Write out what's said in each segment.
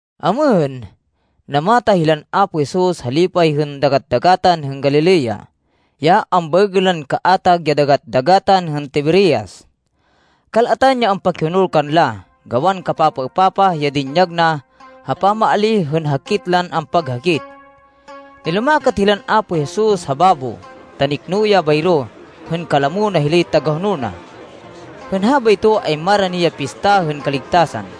Amêhên, namatah hilan Apo Jesus ha lipay hên Dagat-dagatan hên Galilea, ya ambaêgên lan kaatag ya Dagat-dagatan hên Tiberias. Kal-atan ya ampakihonol kanla, gawan kapapaêpapah ya dinyag na ha pamaalíh hên hakit lan ampaghakit. Nilumakat hilan Apo Jesus ha babo, ta nikno ya bayro hên kalamo na hilay tagahonol na. Hên habayto ay marani ya Pista hên Kaligtasan.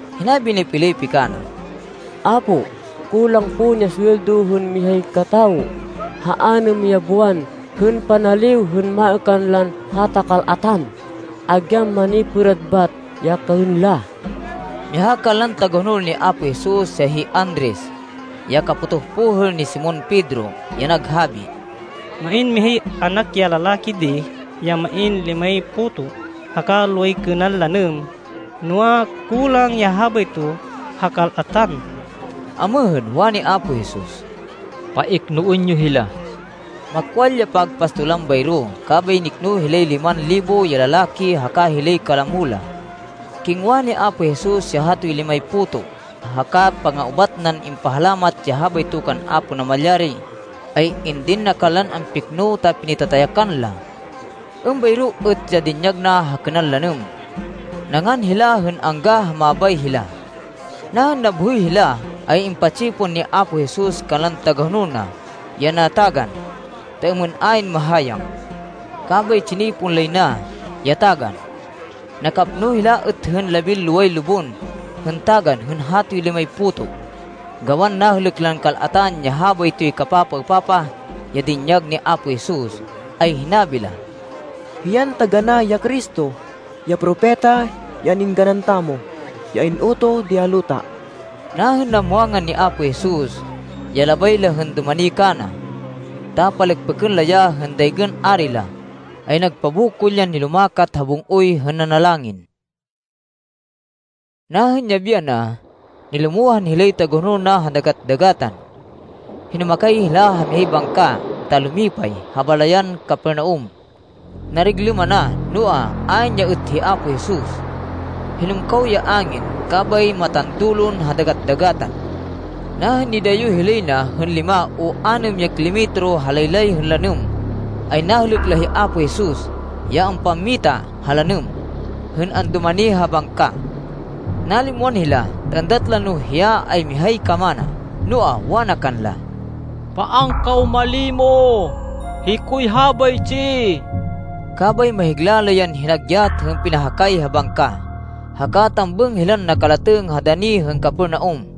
Hinabi ni Felipe kana, “Apo, kulang pon ya suweldo hên mihay katawo ha anêm ya buwan hên panaliw hên maêkan lan hata kal-atan, agyan manipêrad bat ya kaên la.” Miha kanlan tagahonol ni Apo Jesus ya hi Andres, ya kapotoh pohêl ni Simon Pedro ya naghabi, “Main mihay anak ya lalaki di, ya main limay puto, haka loway kênan lanêm. Noa, kulang ya habayto ha kal-atan.” Amêhên, wani Apo Jesus, “Paiknoên yo hila.” Makwal ya pagpastolan bayro, kabay nikno hilay liman libo ya lalaki haka hilay kalamo la. Kingwa ni Apo Jesus ya hatoy limay puto, haka panga-ubat nan impahalamat ya habayto kan Apo Namalyari, ay indin na kanlan ampikno ta pinitatayakan la. Êmbayro êt ya dinyag na ha kênan lanêm. Nangan hila hên angga ha mabay hila. Nahên nabhoy hila ay impa-tsipon ni Apo Jesus kanlan tagahonol na ya natagan, ta êmên ayn mahayang. Kabay tsinipon lay na ya tagan. Nakapno hila êt hên labinloway lubon hên tagan hên hatoy limay puto. Gawan nahêlêk lan kal-atan ya habaytoy kapapaêpapah, ya dinyag ni Apo Jesus, ay hinabi la, “Hiyan taganá ya Cristo, ya Propeta ya an-êngganan tamo, ya in-utoh di ha luta.” Nahên namwangan ni Apo Jesus, ya labay la hên dumani kana, ta palêkpêkên la ya hên daygên ari la, ay nagpabokol yan nilumakat ha bung-oy hên nanalangin. Nahên yabi yana, nilumohan hilay tagahonol na ha dagat-dagatan. Hinumakay hila ha mihay bangka ta lumipay, ha balayan Capernaum. Nariglêm ana, noa, ayn ya êt hi Apo Jesus. Hinumkaw ya angin, kabay matandulon ha dagat-dagatan. Nahên nidayo hilay na hên lima, o anêm ya kilometro ha laylay hên lanêm, ay nahêlêk la hi Apo Jesus, ya ampammita ha lanêm, hên andumani ha bangka. Nalimwan hila, ta êndat la no hiya ay mihay kamana. Noa, wana kanla, “Paan kaw malimo! Hikoy habaytsi!” Kabay mahigla la yan hinagyat hên pinahakay ha bangka, haka tambêng hilan nakalatêng ha dani hên Capernaum.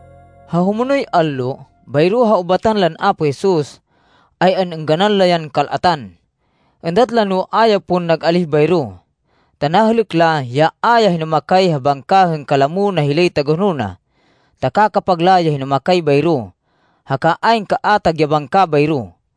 Ha humonoy allo, bayro ha ubatan lan Apo Jesus, ay an-êngganan la yan kal-atan. Êndat la no a ya pon nag-alíh bayro, ta nahêlêk la, ya a ya hinumakay ha bangka hên kalamo na hilay tagahonol na, ta kakapag la ya hinumakay bayro, haka ayn kaatag ya bangka bayro.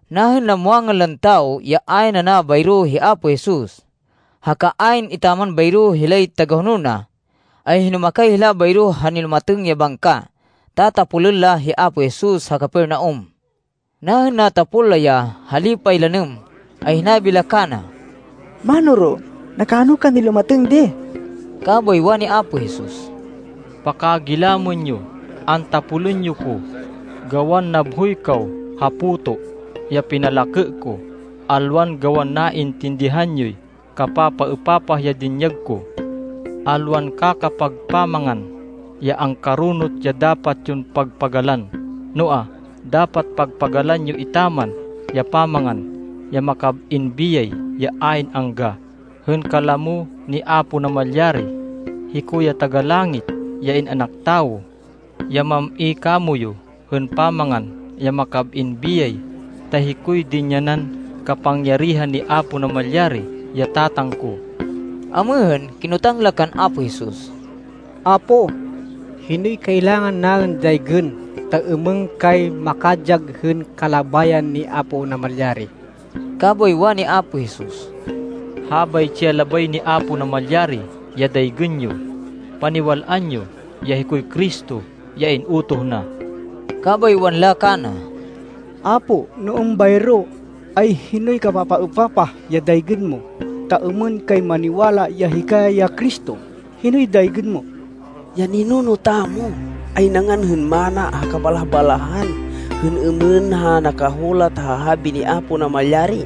Nahên namwangan lan tawo ya ayn ana bayro hi Apo Jesus, haka ayn etaman bayro hilay tagahonol na, ay hinumakay hila bayro ha nilumatêng ya bangka, ta tapolên la hi Apo Jesus ha Capernaum. Nahên natapol la ya ha lipay lanêm ay hinabi la kana, “Mánoro, nakano kan nilumatêng di?” Kabay wani Apo Jesus, “Pakagilamên yo, antapolên yo ko, gawan nabhoy kaw ha puto ya pinalakê ko, alwan gawan naintindihan yoy kapapaêpapah ya dinyag ko. Alwan kakapag pamangan ya angkaronot, ya dapat yon pagpagalan. Noa, dapat pagpagalan yo etaman ya pamangan ya makab-in biyay, ya ayn angga hên kalamo ni Apo Namalyari. Hiko ya Taga-Langit, ya In-anak Tawo, ya mam-i kamoyu hên pamangan ya makab-in biyay, ta hikoy dinyanan kapangyarihan ni Apo Namalyari, ya Tatang ko.” Amêhên, kinotang la kan Apo Jesus, “Apo, hinoy kailangan naên daygên, ta êmên kay makadyag hên kalabayan ni Apo Namalyari?” Kabay wani Apo Jesus, “Habaytsi ya labay ni Apo Namalyari ya daygên yo: paniwal-an yo ya hikoy Cristo ya in-utoh na.” Kabay wanla kana, “Apo, no êmbayro, ay hinoy kapapaêpapah ya daygên mo, ta êmên kay maniwala ya hika ya Cristo? Hinoy daygên mo? Ya ninuno tamo ay nangan hên manna ha kabalah-balahan hên êmên ha nakahulat ha habi ni Apo Namalyari,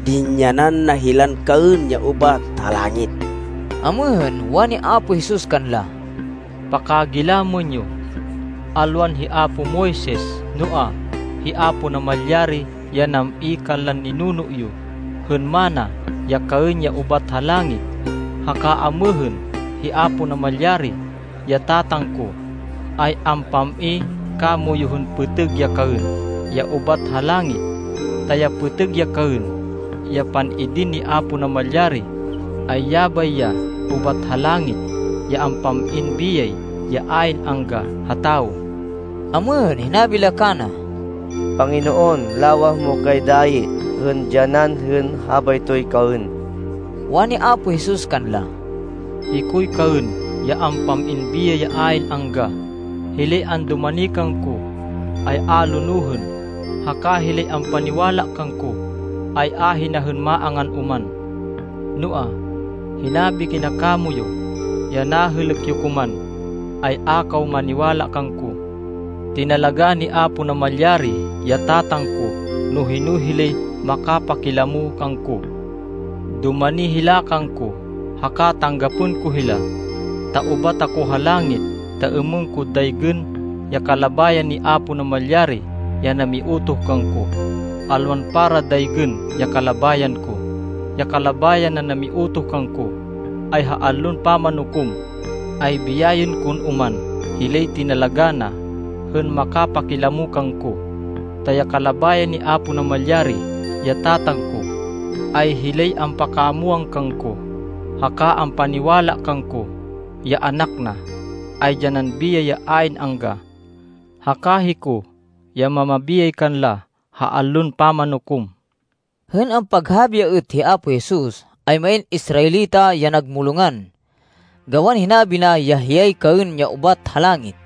‘Dinyanan na hilan kaên ya ubat ha langit.’” Amêhên, wani Apo Jesus kanla, “Pakagilamên yo. Alwan hi apo Moises, noa, hi Apo Namalyari ya nam-i kanlan ninuno yo hên manna ya kaên ya ubat ha langit. Haka amêhên hi Apo Namalyari, ya Tatang ko, ay ampam-i kamoyu hên pêtêg ya kaên, ya ubat ha langit. Ta ya pêtêg ya kaên, ya pan-idin ni Apo Namalyari, ay yabay ya ubat ha langit, ya ampam-in biyay ya ayn angga ha tawo.” Amêhên, hinabi la kana, “Panginoon, lawah mo kay dayi hên dyanan hên habaytoy kaên.” Wani Apo Jesus kanla, “Hikoy kaên ya ampam-in biyay ya ayn angga. Hilay andumani kangko, ay a lonohên, haka hilay ampaniwala kangko, ay ahina hên maangan oman. “Noa, hinabi kina kamoyu ya nahêlêk yo ko man, ay a kaw maniwala kangko. Tinalagá ni Apo Namalyari, ya Tatang ko no hino hilay makapakilamo kangko. Dumani hila kangko haka tanggapên ko hila. Ta ubat ako ha langit, ta êmên ko daygên ya kalabayan ni Apo Namalyari ya namiutoh kangko, alwan para daygên ya kalabayan ko. Ya kalabayan nan namiutoh kangko, ay ha Allon Pamanukom, ay biyayên kon oman hilay tinalagá na hên makapakilamo kangko. Ta ya kalabayan ni Apo Namalyari, ya Tatang ko, ay hilay ampakamwang kangko, haka ampaniwala kangko, ya Anak na, ay dyanan biyay ya ayn angga. Haka hiko ya mamabiyay kanla ha Allon Pamanukom.” Hên ampaghabi ya êt hi Apo Jesus, ay main Israelita ya nagmulongan, gawan hinabi na ya hiyay kaên ya ubat ha langit.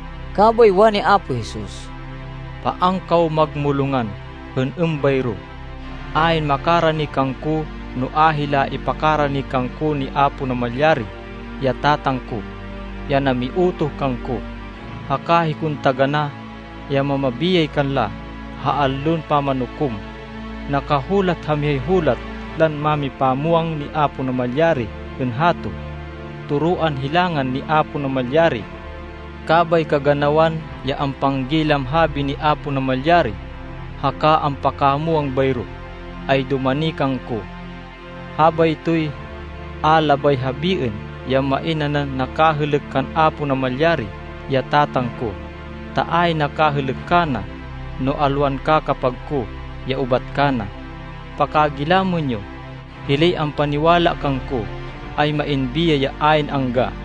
Kabay wani Apo Jesus, “Paan kaw magmulongan hên êmbayro. Ayn makarani kangko no a hila ipakarani kangko ni Apo Namalyari, ya Tatang ko, ya namiutoh kangko. Haka hikon taganá ya mamabiyay kanla ha Allon Pamanukom. Nakahulat ha mihay hulat lan mámipamwang ni Apo Namalyari hên hato, ‘Toroan hilangan ni Apo Namalyari.’ Kabay kaganawan ya ampanggilam habi ni Apo Namalyari haka ampakamwang bayro, ay dumani kangko. Habaytoy a labay habiên ya main nanan nakahêlêk kan Apo Namalyari, ya Tatang ko, ta ayn nakahêlêk kana no alwan kakapag ko ya ubat kana. “Pakagilamên yo. Hilay ampaniwala kangko, ay main biyay ya ayn angga.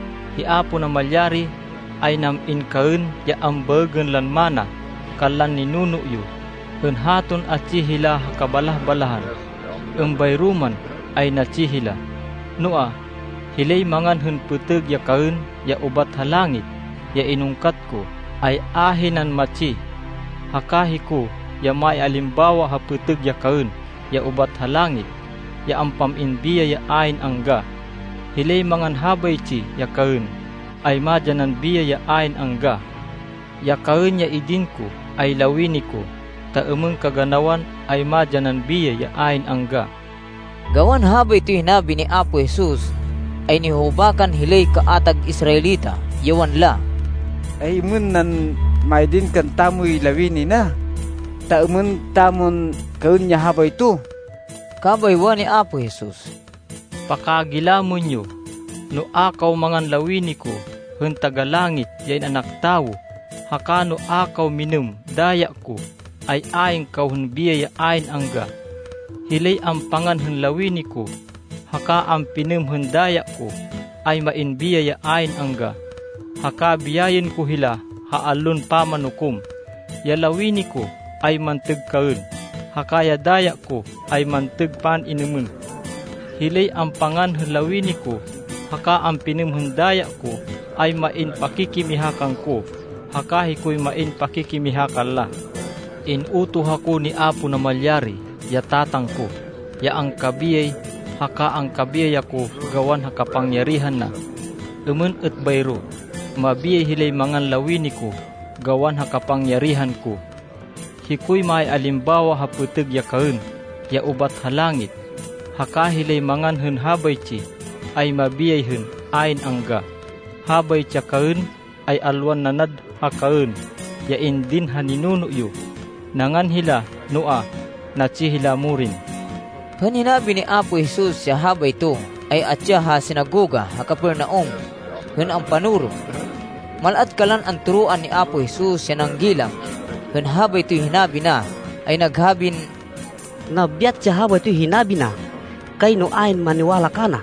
Hi Apo Namalyari ay nam-in kaên ya ambaêgên lan manna kanlan ninuno yo hên haton atsi hila ha kabalah-balahan, êmbayro man ay natsi hila. Noa, hilay mangan hên pêtêg ya kaên ya ubat ha langit, ya inungkat ko, ay ahinan matsi. Haka hiko ya maialimbawa ha pêtêg ya kaên ya ubat ha langit, ya ampam-in biyay ya ayn angga. Hilay mangan habaytsi ya kaên ay madyanan biyay ya ayn angga. Ya kaên ya idin ko ay lawini ko, ta êmên kaganawan ay madyanan biyay ya ayn angga.” Gawan habaytoy hinabi ni Apo Jesus, ay nihuhubakan hilay kaatag Israelita, ya wanla, “Ay-êmên nan maidin kantamoy lawini na, ta êmên tamon kaên ya habayto?” Kabay wani Apo Jesus, “Pakagilamên yo. No a kaw mangan lawini ko, hên Taga-Langit, ya In-anak Tawo, haka no a kaw minêm daya ko, ay ayn kaw hên biyay ya ayn angga. Hilay ampangan hên lawini ko, haka ampinêm hên daya ko, ay main biyay ya ayn angga, haka biyayên ko hila ha Allon Pamanukom. Ya lawini ko ay mantêg kaên haka ya daya ko ay mantêg pan-inêmên. Hilay ampangan hên lawini ko haka ampinêm hên daya ko ay main pakikimiha kangko, haka hikoy main pakikimiha kanla. In-utoh ako ni Apo Namalyari, ya Tatang ko, ya angkabiyay. Haka angkabiyay ako gawan ha kapangyarihan na. Êmên êt bayro mabiyay hilay mangan lawini ko gawan ha kapangyarihan ko. Hikoy maialimbawa ha pêtêg ya kaên ya ubat ha langit, haka hilay mangan hên habaytsi, ay mabiyay hên ayn angga. Habaytsi ya kaên ay alwan nanad ha kaên ya indin ha ninuno yo. Nangan hila noa, natsi hila morin.” Hên hinabi ni Apo Jesus ya habayto, ay atsi ya ha sinagoga ha Capernaum hên ampanoro. Mal-at kanlan antoroan ni Apo Jesus, ya nanggilam hên habaytoy hinabi na, ay naghabin, “Nabyat ya habaytoy hinabi na. Kayno ayn maniwala kana.”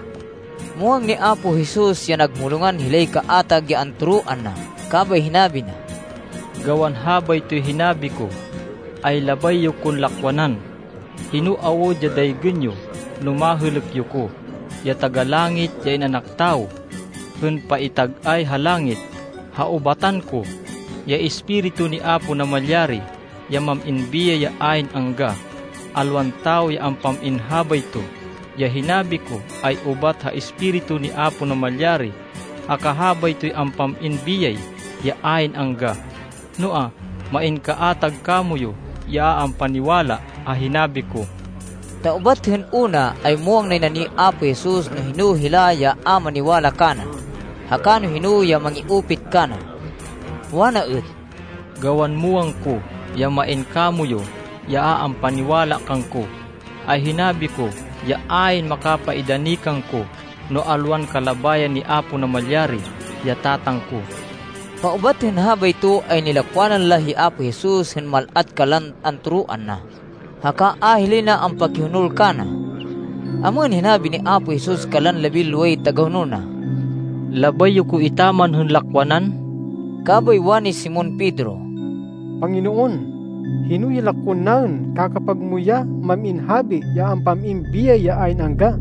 Muwang ni Apo Jesus ya nagmulongan hilay kaatag ya antoroan na, kabay hinabi na, “Gawan habaytoy hinabi ko, ay labay yo kon lakwanan? Hino awud ya daygên yo no mahêlêk yo ko, ya Taga-Langit, ya In-anak Tawo, hên paitag-ay ha langit, ha ubatan ko? Ya Espiritu ni Apo Namalyari ya mam-in biyay ya ayn angga. Alwan tawo ya ampam-in habayto. Ya hinabi ko ay ubat ha Espiritu ni Apo Namalyari, haka habaytoy ampam-in biyay ya ayn angga. Noa, main kaatag kamoyu ya a ampaniwala ha hinabi ko.” Ta ubat hên una, ay muwang nay na ni Apo Jesus no hino hila ya a maniwala kana, haka no hino ya mangi-upit kana. Wana êt, “Gawan muwang ko ya main kamoyu ya a ampaniwala kangko, ay hinabi ko ya ayn makapaidani kangko no alwan kalabayan ni Apo Namalyari, ya Tatang ko.” Paubat hên habayto ay nilakwanan la hi Apo Jesus hên mal-at kanlan antoroan na, haka a hilay na ampakihonol kana. Amêhên, hinabi ni Apo Jesus kanlan labinloway tagahonol na, “Labay yo ko etaman hên lakwanan?” Kabay wani Simon Pedro, “Panginoon, hino ya lakwên naên? Kakapag mo ya main habi ya ampam-in biyay ya ayn angga!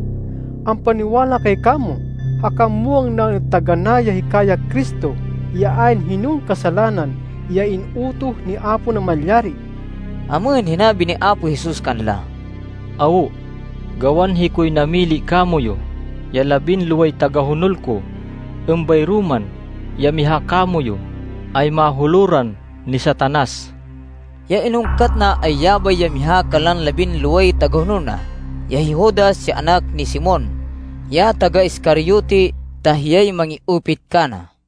Ampaniwala kay kamo, haka muwang naên taganá ya hika ya Cristo, ya ayn hinon kasalanan, ya in-utoh ni Apo Namalyari.” Amêhên, hinabi ni Apo Jesus kanla, “Awo, gawan hikoy namili kamoyu, ya labinloway tagahonol ko. Êmbayro man, ya miha kamoyu ay mahuloran ni Satanas.” Ya inungkat na, ay yabay ya miha kanlan labinloway tagahonol na, ya hi Judas, ya anak ni Simon, ya taga-Iscariote ta hiyay mangi-upit kana.